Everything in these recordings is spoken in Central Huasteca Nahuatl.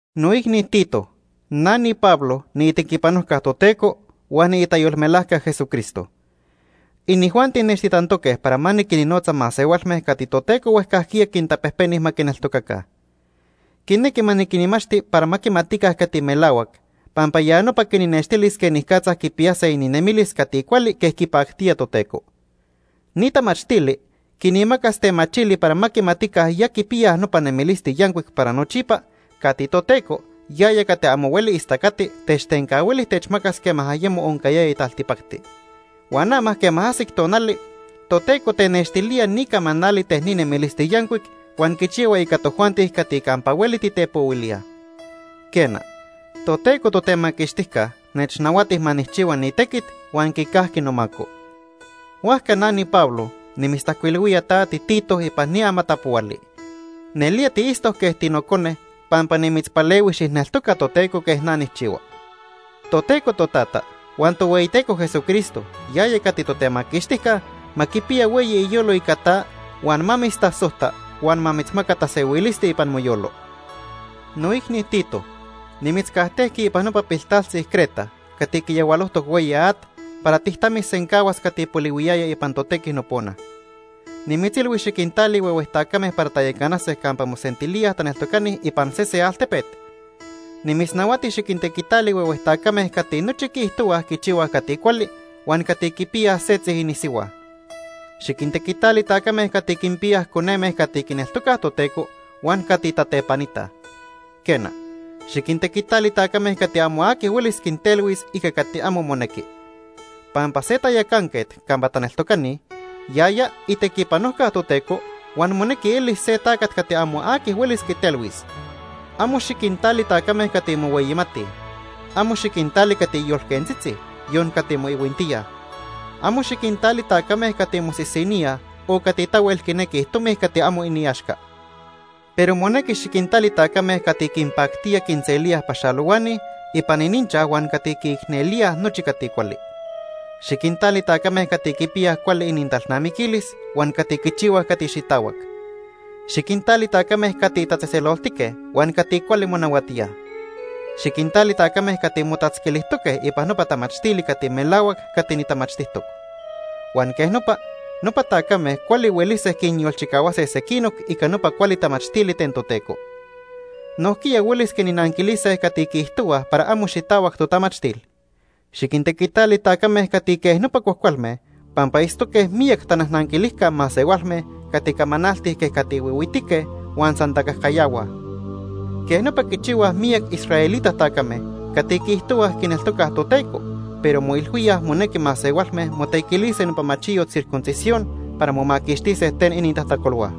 Noicni Tito, na niPablo niitequipanojca Toteco huan niitayolmelajca Jesucristo. Inijuanti nechtitantoque para ma niquinnotza masehualme cati Toteco huejcajquiya quintapejpeni ma quineltocaca. Quinequi ma niquinmachti para ma quimatica cati melahuac, pampa ya nopa quinnextilis quenicatza quipiyase ininemilis cati cuali quej quipactía Toteco. Ni tamachtili quinmacas temachili para ma quimatica ya quipiyaj nopa nemilisti yancuic para nochipa cati Toteco, yaya cati amo hueli istacati, techtencahuili techmacas quema ayemo oncayaya taltipacti. Huan ama quema ajsic tonali, Toteco tenextilía ni camanali ten ni nemilisti yancuic huan quichihua ica tojuanti cati campa hueli titepohuilíaj. Quena, Toteco Totemaquixtijca nechnahuati ma nijchihua ni tequit huan quicajqui nomaco. Huajca na niPablo nimitztajcuilhuía ta tiTito ipan ni amatapohuali. Nelía tiitztoc quej tinocone pampa nimitzpalehui xijneltoca Toteco quej na nijchihua. Toteco Totata huan Tohueyiteco Jesucristo yaya cati Totemaquixtijca ma quipiya hueyi iyolo ica ta huan ma mitztasojta huan ma mitzmaca tasehuilisti ipan moyolo. Noicni Tito, nimitzcajtejqui ipan nopa piltaltzi Creta cati quiyahualojtoc hueyi at para tijtamisencahuas cati polihuiyaya ipan totequi nopona. Nimitzilhui xiquintali huehue tacame para tayacanase campa mosentilíaj taneltocani ipan sese altepet. Nimitznahuati xiquintequitali huehue tacame cati nochi quiijtohuaj quichihuaj cati cuali huan cati quipiyaj setzi inisihua. Xiquintequitali tacame cati quinpiyaj coneme cati quineltocaj Toteco huan cati tatepanitaj. Quena, xiquintequitali tacame cati amo aqui huelis quintelhuis ica cati amo monequi. Pampa se tayacanquet campa taneltocani, yaya itequipanojca Toteco huan monequi elis se tacat cati amo aqui huelis quitelhuis. Amo xiquintali tacame cati mohueyimatij. Amo xiquintali cati yolquentzitzi, yon cati moihuintíaj. Amo xiquintali tacame cati mosisiníaj o cati tahuel quinequi tomi cati amo iniaxca. Pero monequi xiquintali tacame cati quinpactía quinselíaj paxalohuani ipan ininchaj huan cati quiicnelíaj nochi cati cuali. Xiquintali tacame cati quipiyaj cuali inintalnamiquilis huan cati quichihuaj cati xitahuac. Xiquintali tacame cati tatzejtzeloltique huan cati cuali monahuatíaj. Xiquintali tacame cati motatzquilijtoque ipan nopa tamachtili cati melahuac cati nitamachtijtoc. Huan quej nopa, nopa tacame cuali huelise quinyolchicahuase sequinoc ica nopa cuali tamachtili ten Toteco. Nojquiya huelis quinnanquilise cati quiijtohuaj para amo xitahuac totamachtil. Xiquintequitali tacame cati quej nopa cuajcualme pampa itztoque miyac tanajnanquilijca masehualme cati camanaltij quej cati huihuitique huan san tacajcayahua. Quej nopa quichihuaj miyac israelita tacame cati quiijtohuaj quineltocaj Toteco, pero moilhuíaj monequi masehualme motequilise nopa machiyot circuncisión para momaquixtise ten inintajtacolhua.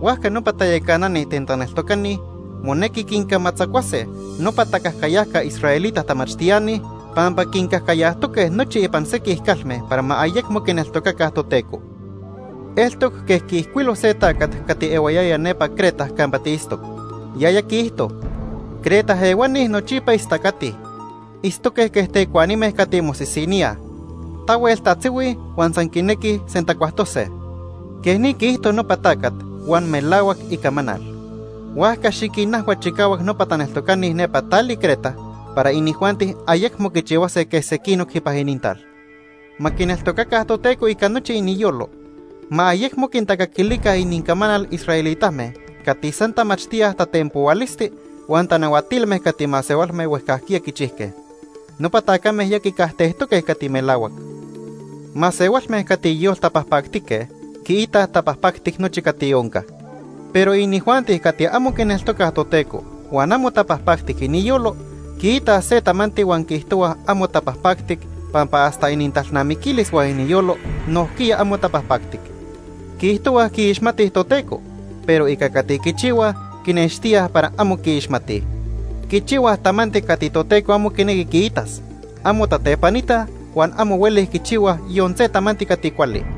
Huajca nopa tayacanani ten taneltocani monequi quincamatzacuase nopa tacajcayajca israelita tamachtiani pampa quincajcayajtoque nochi ipan sequij calme para ma ayecmo quineltocaca Toteco. Eltoc quej quiijcuilo se tacat cati ehuayaya nepa Creta campa tiitztoc, yaya quiijto: “Creta ehuani nochipa istacatij. Itztoque quej tecuanime cati mosisiníaj. Tahuel tatzihuij huan san quinequij sentacuajtose.” Quej ni quiijto nopa tacat, huan melahuac icamanal. Huajca, xiquinajhua chicahuac nopa taneltocani nepa tali Creta para inijuanti ayecmo quichihuase quej sequinoc ipan inintal. Ma quineltocaca Toteco ica nochi iniyolo. Ma ayecmo quintacaquilica inincamanal israelitame cati san tamachtíaj tatempohualisti huan tanahuatilme cati masehualme huejcajquiya quichijque. Nopa tacame ya quicajtejtoque cati melahuac. Masehualme cati yoltapajpactique quiitaj tapajpactic nochi cati onca. Pero inijuanti cati amo quineltocaj Toteco huan amo tapajpactic iniyolo, quiita se tamanti huan quiijtohuaj amo tapajpactic pampa hasta inintalnamiquilis huan iniyolo nojquiya amo tapajpactic. Quiijtohuaj quiixmatij Toteco, pero ica cati quichihuaj, quinextíaj para amo quiixmatij. Quichihuaj tamanti cati Toteco amo quinequi quiitas. Amo tatepanitaj huan amo huelij quichihuaj yon se tamanti cati cuali.